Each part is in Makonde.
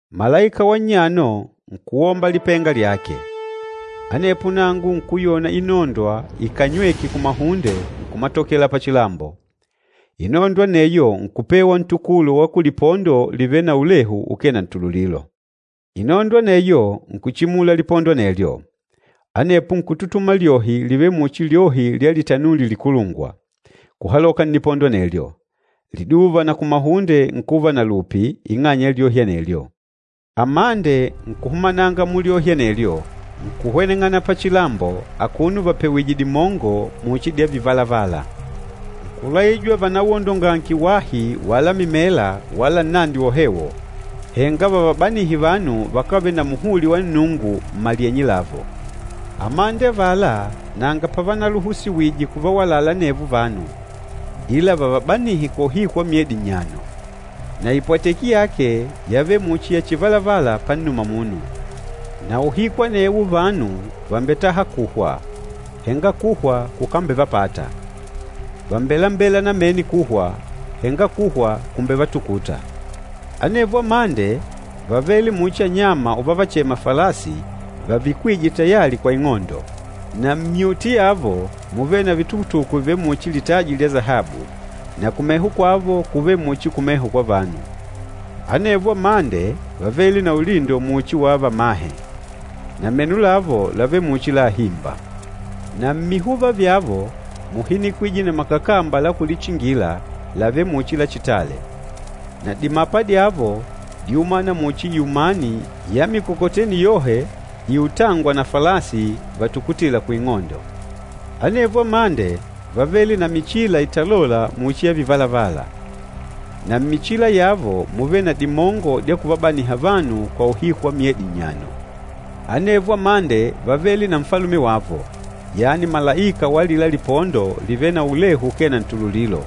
Malaika wa nnyano nkuwomba lipenga lyake. Anepo nangu nkuyona inondwa ikanywêke kumahunde nkumatokela pachilambo. Inondwa aneyo nkupewa ntukulo wa kulipondo livêle na ulehu ukee na ntululilo. Inondwa aneyo nkuchimula lipondo anelyo. Anepo nkututuma lyohi livêle muchi lyohi lya litanuli likulungwa, kuhaloka nnipondo anelyo. Liduva na kumahunde nkuva na lupi ing'anya ya lyohi anelyo. Amande nkuhumananga mulyohi anelyo, nkuhweneng'ana pachilambo akuno vapewìjè dimongo muchi dya vivalavala. Nkulaijwa vanawondongange wahi wala mimela wala nnandi wohewo, henga vavabanihe vanu vakávele na muhuli wa Nnungu mmalyenye lavo. Amande avala nanga pavanaluhusiwije kuvawalala anevo vanu, ila vavabanihe kwa uhiku wa myedi nnyano. Na ipwateki yake yávele muchi ya chivalavala pannuma munu. Na uhiku anewo vanu vàmbetaha kuhwa, henga kuhwa kukambevapata. Vàmbelembela namene kuhwa, henga kuhwa kumbevatukuta. Anevo amande vávele muchi anyama uvavachema falasi vavikwîje tayali kwa ing'ondo. Na mmyuti yavo múvele na vitukutuku vivêle muchi litaji lya sahabu na kumeho kwavo kúvele muchi kumeho kwa vanu. Anevo amande vávele na ulindo muchi wa vamahe, na meno lavo lávele muchi la ahimba. Na mmihuva vyavo múhinikwije na makakamba la kulichingila lavêle muchi lachitale. Na dimapa dyavo díumana muchi iumani ya mikokoteni yohe iutângwa na falasi vatukutîla kuing'ondo. Anevo amande vávele na michila italôla muchi ya vivalavala. Na mmichila yavo múvele na dimongo dya kuvabaniha vanu kwa uhiku wa myedi nnyano. Anevo amande vávele na nfalume wavo, yani malaika wa alila lipondo livêle na ulehu ukee na ntululilo,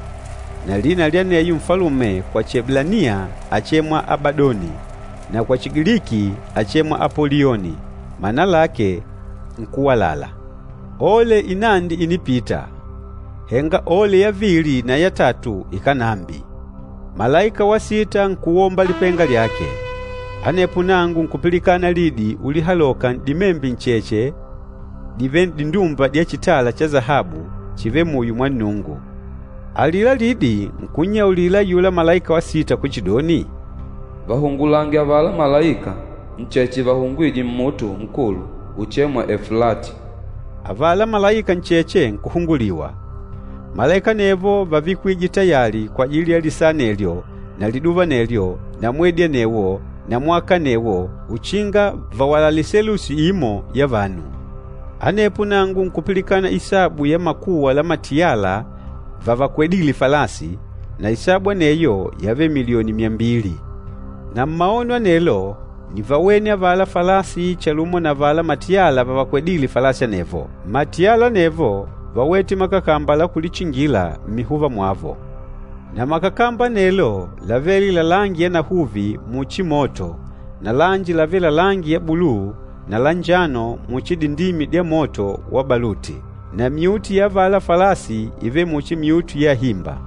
na lina lya aneyo nfalume kwa Chieblaniya áchemwa Abadoni, na kwa Chigiliki áchemwa Apolioni, mana lake nkúwalala. Ole inandi ìnipita, henga ole yavili na ya tatu ikánambi. Malaika wa sita nkuwomba lipenga lyake. Anepo nangu nkupilikana lidi ulihaloka n'dimembe ncheche divêle n'dindumba dya chitala cha sahabu chivêle muyo mwa Nnungu. Alila lidi nkunnyaulila ayula malaika wa sita kuchidoni, “Vahungulange avala malaika ncheche vahungwîje mmuto nkulu uchêmwa, Eflati.” Avala malaika ncheche nkuhunguliwa. Malaika anevo vávikwije tayali kwajili ya lisaa anelyo na liduva anelyo na mwedi anewo na mwaka anewo uchinga vawalale selusi imo ya vanu. Anepo nangu nkupilikana isabu ya makuwa la matiyala vavakwedîle falasi, na isabu aneyo yávele milioni myambili. Na mmaono anelo nívawene avala falasi chalumo na avala matiyala vavakwedîle falasi anevo. Matiyala anevo váwete makakamba la kulichingila mmihuva mwavo. Na makakamba anelo lavêle la langi yanahuvi muchi moto na lanji lavêle la langi ya buluu na lanjano muchi dindimi dya moto wa baluti. Na myuti ya avala falasi ívele muchi myuti ya ahimba,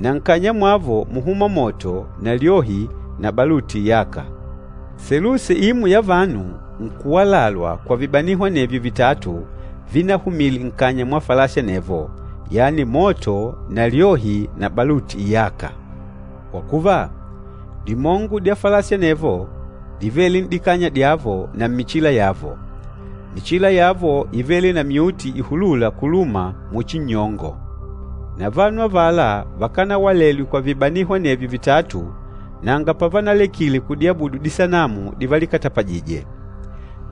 na nkanya mwavo múhuma moto na lyohi na baluti iyâka. Selusi imo ya vanu nkuwalalwa kwa vibaniho anevyo vitatu vinahumile nkanya mwa falasi anevo, yani moto na lyohi na baluti iyâka. Kwa kuva, dimongo dya falasi anevo dívele n'dikanya dyavo na mmichila yavo. Michila yavo ívele na myuti ihulûla kuluma muchi nnyongo. Na vanu avala vakanawalelwe kwa vibaniho anevyo vitatu nanga pavanalekile kudiabudu disanamu divalikatapajije.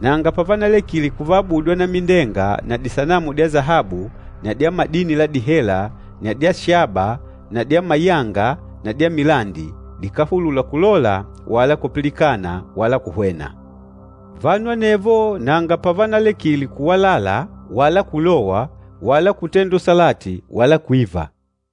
Nanga pavanalekile kuvaabudu anamindenga na disanamu dya sahabu na dya madini la dihela na dya shaba na dya mayanga na dya milandi, dikáhulula kulola wala kupilikana wala kuhwena. Vanu anevo nanga pavanalekile kuwalala wala kulowa wala kutenda usalati wala kwiva.